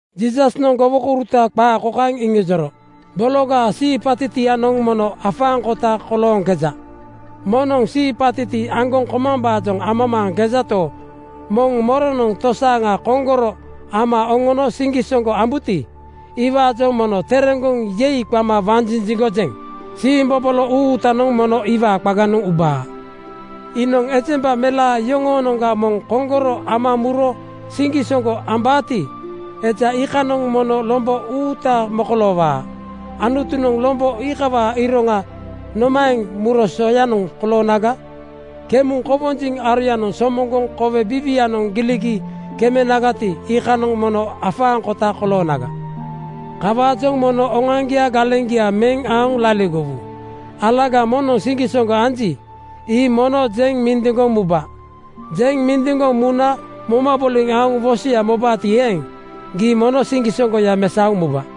Jiisasnoŋ gowokouruta qaa kokaeŋ iŋijoro, “Bologaa siipatitianoŋ mono afaaŋkota kolooŋkeja. Moŋnoŋ siipatiti aŋgoŋ komambaajoŋ amamaaŋkejato, moŋ moronoŋ tosaaŋa koŋgoro ama oŋono siŋgisoŋgo ambuti, iwaajoŋ mono tereŋgoŋ ‘Yei!’ qama wanjinjiŋgojeŋ. Siimbobolo uutanoŋ mono iwaa qaganoŋ ubaa. Iinoŋ ejemba melaa iyoŋoonoŋga moŋ koŋgoro ama muro siŋgisoŋgo ambaati, eja iikanoŋ mono lombo uuta mokoloowaa. Anutunoŋ lombo iikawaa iroŋa nomaeŋ muro soyanoŋ koloonaga? Kemuŋ kowonjiŋ aroyanoŋ somoŋgoŋ kowe biiwianoŋ giligi kemenagati, iikanoŋ mono afaaŋkota koloonaga. “Kawaajoŋ mono oŋoaŋgia galeŋgia meŋ aoŋ laligowu. Alaga moŋnoŋ siŋgisoŋgo anji, ii mono jeŋ mindiŋgoŋ muba. Jeŋ mindiŋgoŋ muna moma boliŋ aoŋ wosoya mobaati eeŋ, gii mono siŋgisoŋgoya mesaoŋ muba.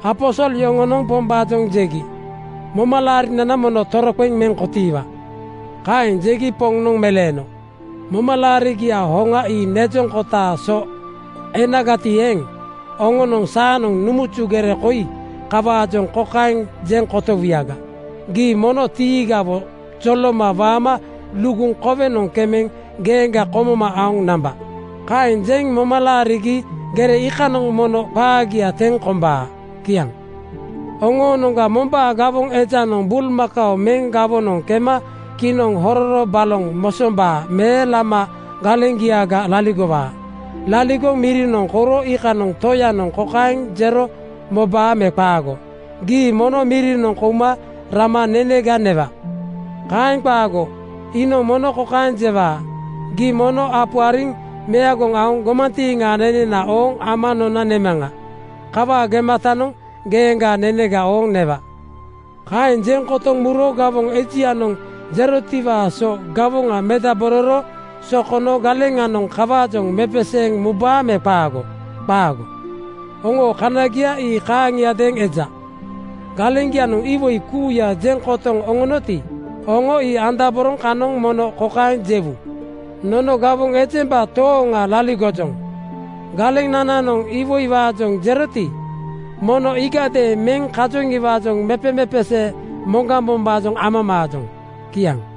Aposol yoŋonoŋ Pombaajoŋ jegi, “Momalaarinana mono toroqeŋ meŋ kotiiwa.” Kaeŋ jegi Poŋnoŋ meleeno, “Momalaarigiaa hoŋa ii nejoŋ kotaa so enagati eeŋ, oŋonoŋ saanoŋ numuzu gere koi kawaajoŋ kokaeŋ jeŋ kotowuyaga, ‘Gii mono tiigawo joloma waama luguŋ kowenoŋ kemeŋ geeŋga komoma aoŋ namba.’ Kaeŋ jeŋ moma laarigi gere iikanoŋ mono qaagia teŋ kombaa.” Kiaŋ. “Oŋoonoŋga mombaa gawoŋ ejanoŋ bulmakao meŋ gawonoŋ kema kinoŋ hororo baloŋ mosombaa me lama galeŋgiaga laligowaa. Laligoŋ mirinoŋ kouro iikanoŋ toyanoŋ kokaeŋ jero mobaa me qaago, ‘Gii mono mirinoŋ kouma rama nenega newa.’ Kaeŋ qaago! Iinoŋ mono kokaeŋ jewaa: ‘Gii mono apu ariŋ meagoŋ aoŋ gomantiiŋaa nenena ooŋ ama nona nemaŋa. Kawaa gematanoŋ geeŋgaa nenega ooŋ newa.’ Kaeŋ jeŋ kotoŋ muro gawoŋ ejianoŋ jerotiwaa so gawoŋa medabororo sokono galeŋanoŋ kawaajoŋ mepeseeŋ mubaa me qaago? Qaago! Oŋoo kanagia ii kaaŋiadeeŋ eja. Galeŋgianoŋ iwoi kuuya jeŋ kotoŋ oŋonoti, oŋo ii andaboroŋ kanoŋ mono kokaeŋ jewu, ‘Nono gawoŋ ejemba tooŋa laligojoŋ. Galenananoŋ iwoiwaajoŋ jeroti, mono iigadeeŋ meŋ kajoŋiwaajoŋ mepemepesee moŋgambombaajoŋ amamaajoŋ.’” Kiaŋ.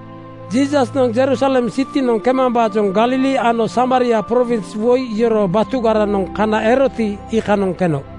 Jiisasnoŋ Jerusalem sitinoŋ kemambaajoŋ Galili ano Samaria prowins woi yoroo batugaranoŋ kana eroti, iikanoŋ keno.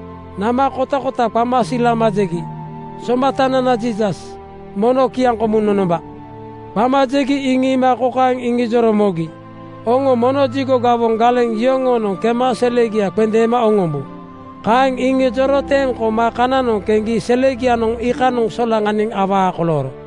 Nama kotakota qama silama jegi, “Somatanana Jiisas, mono kiaŋkomuŋ nonomba!” Qama jegi iŋiima kokaeŋ iŋijoro mogi, “Oŋo mono jigo gawoŋ galeŋ yoŋoonoŋ kema selegia qendeema oŋombu.” Kaeŋ iŋijoro teŋ koma kananoŋ keŋgi selegianoŋ iikanoŋ solaŋaniŋ awaa kolooro.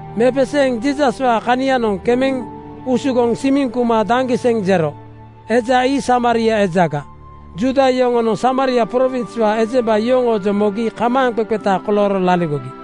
Mepeseeŋ Jiisaswaa kanianoŋ kemeŋ usugoŋ simiŋ kuma ‘Daŋgiseŋ!’ jero. Eja ii Samaria ejaga. Juuda yoŋonoŋ Samaria prowinswaa ejemba yoŋoojoŋ mogi kamaaŋqeqeta kolooro laligogi.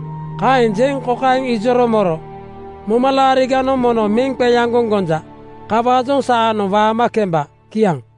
Kaeŋ jeŋ kokaeŋ ijoro moro, “Momalaariganoŋ mono meŋ qeaŋgoŋ gonja. Kawaajoŋ saanoŋ waama kemba.” Kiaŋ.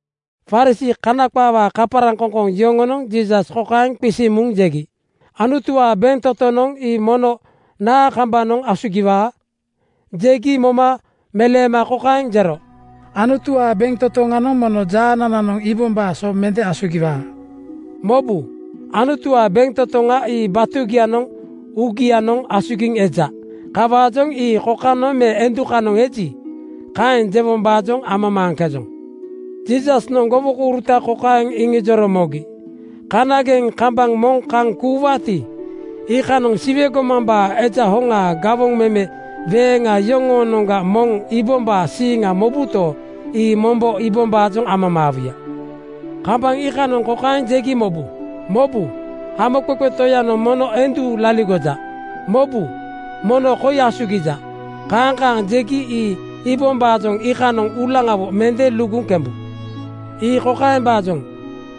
Farisii (Kana qaawaa kaparaŋkoŋkoŋ) yoŋonoŋ Jiisas kokaeŋ qisiŋ muŋ jegi, “Anutuwaa bentotoŋ ii mono naa kambanoŋ asugiwaa?” Jegi moma meleema kokaeŋ jero, “Anutuwaa bentotoŋanoŋ mono jaanananoŋ iibombaa so mende asugiwaa. Mobu! Anutuwaa bentotoŋa ii batugianoŋ uugianoŋ asugiŋ eja. Kawaajoŋ ii kokanoŋ me endukanoŋ eji, kaeŋ jewombaajoŋ amamaaŋkejoŋ.” Jiisasnoŋ gowokouruta kokaeŋ iŋijoro mogi, “Kanageŋ kambaŋ moŋ kaŋ kuuwaati, iikanoŋ Siwe gomambaa Eja hoŋaa gawoŋ meme weeŋa yoŋoonoŋga moŋ iibombaa siiŋa mobuto, ii mombo iibombaajoŋ amamaawuya. Kambaŋ iikanoŋ kokaeŋ jegi mobu, ‘Mobu! Hamoqeqe Toyanoŋ mono endu laligoja. Mobu! Mono koi asugija.’ Kaaŋ kaaŋ jegi ii iibombaajoŋ iikanoŋ uulaŋawo mende luguŋ kembu. Ii kokaembaajoŋ: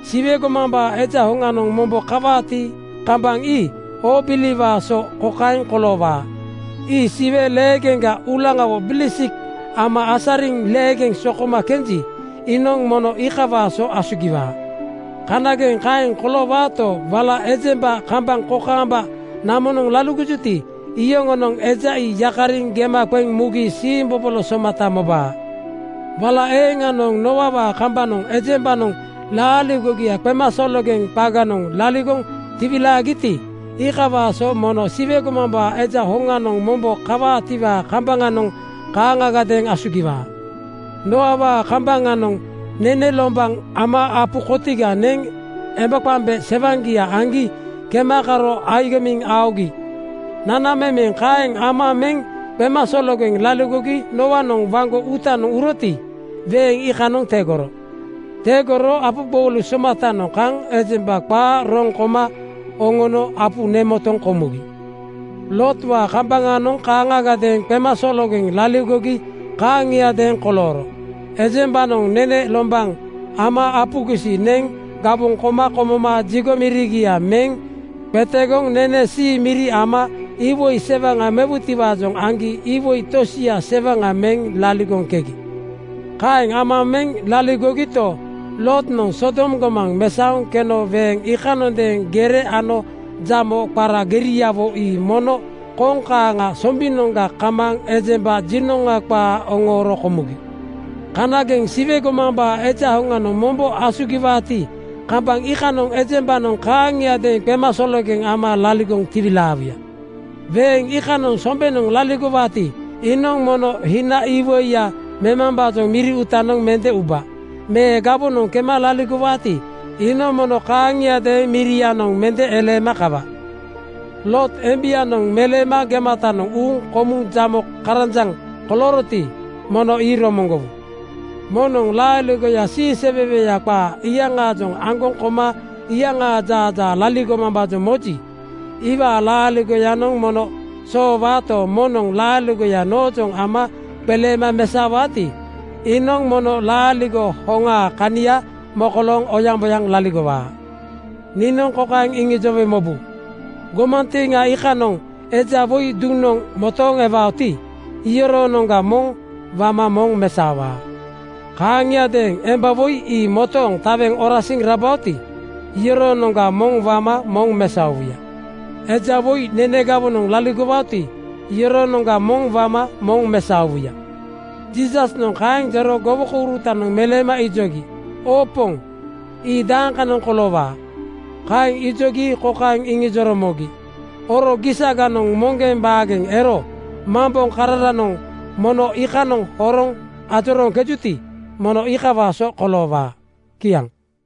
Siwe gomambaa Eja hoŋanoŋ mombo kawaati, kambaŋ ii oobiliwaa so kokaeŋ koloowaa: Ii siwe leegeŋga uulaŋawo bilisik ama asariŋ leegeŋ sokoma kenji, iinoŋ mono iikawaa so asugiwaa. Kanageŋ kaeŋ koloowaato, wala ejemba kambaŋ kokaamba namonoŋ laligojuti, iyoŋonoŋ eja ii yakariŋ gema qeŋ mugi siimbobolo somata mobaa. “Wala eeŋanoŋ Nooawaa kambaŋanoŋ ejembanoŋ laaligogia qemasologeŋ qaganoŋ laligoŋ tiwilaagiti, iikawaa so mono Siwe gomambaa Eja hoŋanoŋ mombo kawaatiwaa kambaŋanoŋ kaaŋagadeeŋ asugiwaa. Nooawaa kambaŋanoŋ nene lombaŋ ama apu kotiga neŋ embaqemba sewaŋaa aŋgi kema karo agimiŋ aogi. Nanamemeŋ kaeŋ ama meŋ qemasologeŋ laligogi Nooanoŋ waŋgo uutanoŋ uroti, weeŋ iikanoŋ tegoro. Tegoro apu gboulu somatanoŋ kaŋ ejemba qaa roŋ koma oŋono apu nemotoŋ komugi. “Lootwaa kambaŋanoŋ kaaŋagadeeŋ qemasologeŋ laligogi kaaŋiadeeŋ kolooro. Ejembanoŋ nene lombaŋ ama apu gisi neŋ gawoŋ koma komoma jigo mirigia meŋ qetegoŋ nene sii miri ama iwoi sewaŋa mewutiwaajoŋ aŋgi iwoi tosia sewaŋa meŋ laligoŋkegi. Kaeŋ ama meŋ laligogito, Lootnoŋ Sodom gomaŋ mesaoŋ keno weeŋ iikanondeeŋ gere ano jamo qara geriawo ii mono koŋ kaaŋa sombinoŋga kamaaŋ ejemba jinoŋa qaa oŋooro komugi. Kanageŋ Siwe gomambaa Eja hoŋanoŋ mombo asugiwaati, kambaŋ iikanoŋ ejembanoŋ kaaŋiadeeŋ qemasologeŋ ama laligoŋ tiwilaawuya. “Weeŋ iikanoŋ sombenoŋ laligowaati, iinoŋ mono hina iwoiya memambaajoŋ miri uutanoŋ mende uba me gawonoŋ kema laligowaati, iinoŋ mono kaaŋiadeeŋ mirianoŋ mende eleema kawa. Loot embianoŋ meleema gematanoŋ uuŋ komuŋ jamo karanjaŋ kolooroti, mono ii romoŋgowu. Moŋnoŋ laaligoya siiseweweya qaa iyaŋaajoŋ aŋgoŋ koma iyaŋaa jaajaa laligomambaajoŋ moji, iwaa laaligoyanoŋ mono soowaato, moŋnoŋ laaligoya noojoŋ ama qeleema mesaowaati, iinoŋ mono laaligo hoŋaa kania mokolooŋ oyaŋboyaŋ laligowaa. “Niinoŋ kokaeŋ iŋijowe mobu: gomantiiŋa iikanoŋ eja woi duŋnoŋ motooŋ ewaoti, iyoroonoŋga moŋ wama moŋ mesaowuya. Kaaŋagadeeŋ emba woi ii motooŋ taweŋ orasiŋ rabaoti, iyoroonoŋga moŋ wama moŋ mesaowuya.” (Eja woi nene gawonoŋ laligowaoti, iyoroonoŋga moŋ wama moŋ mesaowuya.) Jiisasnoŋ kaeŋ jero gowokourutanoŋ meleema ijogi, “Oo Poŋ, ii dakanoŋ koloowaa?” Kaeŋ ijogi kokaeŋ iŋijoro mogi, “Oro gisaganoŋ moŋgeŋ baageŋ ero mamboŋkararanoŋ mono iikanoŋ horoŋ ajorooŋkejuti, mono iikawaa so koloowaa.” Kiaŋ.